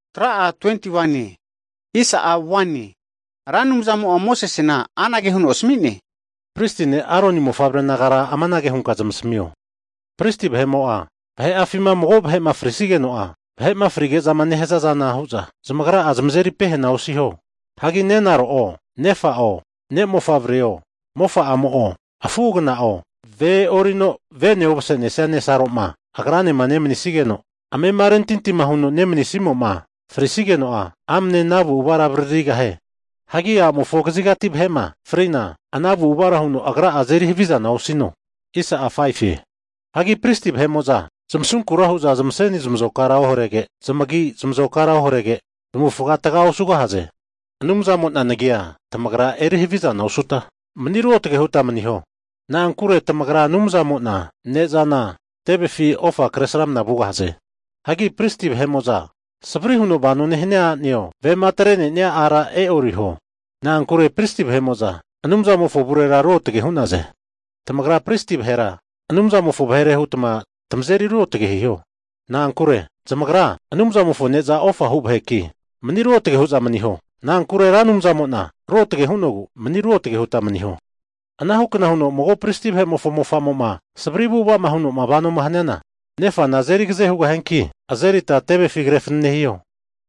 Ra Anumzamo'a Mosesena amanage huno asmi'ne, Pristi ne' Aroni mofavre nagara amanage hunka zamasamio, pristi vahe'mo'a vahe'afima mago vahe'ma frisigeno'a, vahe'ma frige'za nehaza zana hu'za zamagra'a zamazeri pehana osiho. Hagi nerera'o nefa'o ne' mofavre'o mofa'amo'o afu agana'o, ve e'orino vene omasenesia nesaroma agranema nemanisigeno amema rentinti huno nemanisimo'ma frisigeno'a, amane ana avu'avara avaririgahie. Hagi a'amofo kazigati vahe'ma fri'na ana avu'avara huno agra'a azeri havizana osino. Hagi pristi vahe'mo'za zmasunkura hu'za zamaseni zamazokara oharege, zamagi zamazokara oharege, zamavufaga taga osugahaze. Anumzamo'na nagi'a tamagra eri havizana osuta, mani ruotage huta maniho. Na'ankure tamagra Anumzamo'na ne'zana tevefi ofa kresramna vugahaze. Hagi pristi vahe'mo'za savri huno vanoma nehania a'neo, vema atre'nenia ara e'oriho. Na'ankure pristi vahe'mo'za Anumzamofo avurera ruotage hu'naze. Tamagra pristi vahera Anumzamofo vahere hutma zamazeri ruotage hiho, na'ankure zamagra Anumzamofo ne'za ofa hu vaheki, mani ruotage hu'za maniho. Nagra Ra Anumzamo'na ruotage hu'nogu, mani ruotage hutma maniho. Anahukna huno mago pristi vahe'mofo mofa'mo'ma savri avu'ava huno'ma vanoma haniana, nefana azeri agaze hugahianki, azerita tevefi krefanane hiho.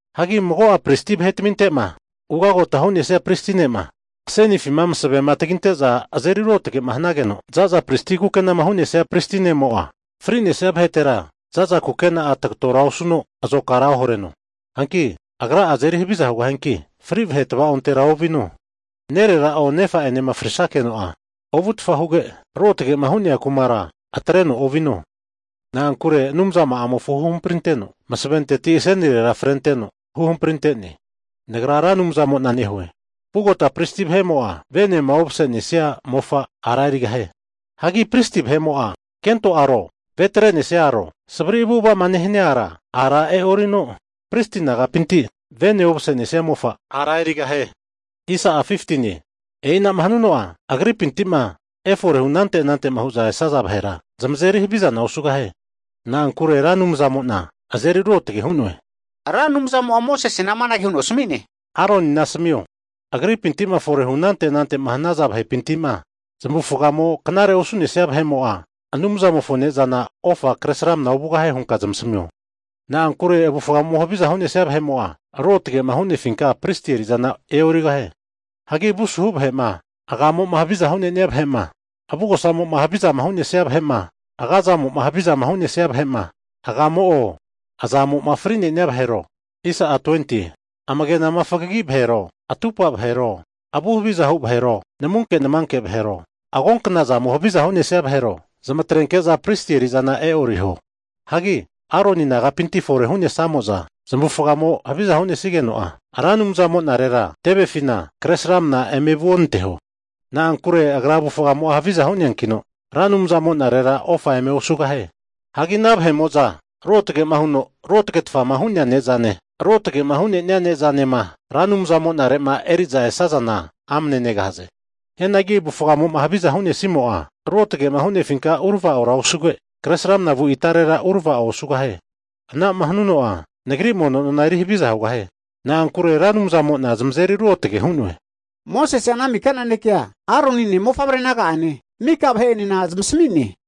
Hagi mago'a pristi vahetaminte'ma ugagota hu'nesia pristi ne'ma asenifi masave taginte'za azeri ruotage hanageno, za'za pristi kukenama hu'nesia pristi ne'mo'a fri'nesia vahetera za'za kukena'a tagatora osuno azokara ohareno. Hagi Agra'a azeri haviza hugahianki, fri vahe tava'ontera ovino. Nerera'o nefa'enena frisakeno'a ovutfa huge, ruotge'ma hu'nea kumara atreno ovino, na'ankure Anumza ma'amofo huhamprinteno masaventeti asenirera frenteno huhampri ante'ne. Nagra Ra Anumzamo'na nehue. Vugota pristi vahe'mo'a venema omasenenia mofa ara erigahie. Hagi pristi vahe'mo'a kento aro, ve atre'nesia aro, savri avu'ava nehania ara, ara e'orino pristi nagapinti vene ovase'nesia mofa ara erigahie. E'ina'ma hanuno'a agripinti'ma efore hu anante anante'ma hu'za esaza vahera zamazeri havizana osugahie. Na'ankure Ra Anumzamo'na azeri ruotage hu'noe. Ra Anumzamo'a Mosesena amanage huno asmi'ne, Aronina asamio, agripintima forehu anante anante hanaza vahepinti'ma zamavufagamo knare'ma osu'nesia vahe'mo'a Anumzamofo ne'zana ofa kresramna ovugahie hunka asamio. Na'ankure avufgamo havizama hu'nesia vahe'mo'a, ruotage'ma hu'nefinka pristi eri'zana e'origahie. Hagi avu asuhu vahe'ma, agamo'ma havizama hu'nenia vahe'ma, avugosamo'ma havizama hu'nesia vahe'ma, agazamo'ma havizama hu'nesia vahe'ma, agamo'o azamo'ma fri'nenia vahero, amage'na fagagi vahero, atupa vahero, avu havizahu vahero, namunke namanke vahero, agonknazamo haviza hu'nesia vahero, zmatrenke'za pristi eri'zana e'oriho. Hagi Aroni nagapinti fore hu'nesamoza zamavufagamo havizama hu'nesigeno'a, Ra Anumzamo'narera tevefina kresramna eme vuonanteho. Na'ankure agra avufgamo'a haviza hu'neankino, Ra Anumzamo'narera ofa eme osugahie. Hagi ana vahe'mo'za ruotage huno ruotage'tfama hu'nea ne'zane, ruotage'ma hu'nenia ne'zanema Ra Anumzamonare'ma eri'za esazana amane negahaze. Hianagi avufgamo'a haviza hu'nesimo'a, ruotage'ma hu'nefinka uravao osuge, kresramna vu itarera uravao osugahie. Ana'ma hanuno'a Nagri mono nona eri haviza hugahie. Na'ankure Ra Anumzamo'na zamazeri ruotage hu'noe. Mosese'a ana mika nanekea Aronine mofavre naga'ane, miko vahe'enena zamasmi'ne.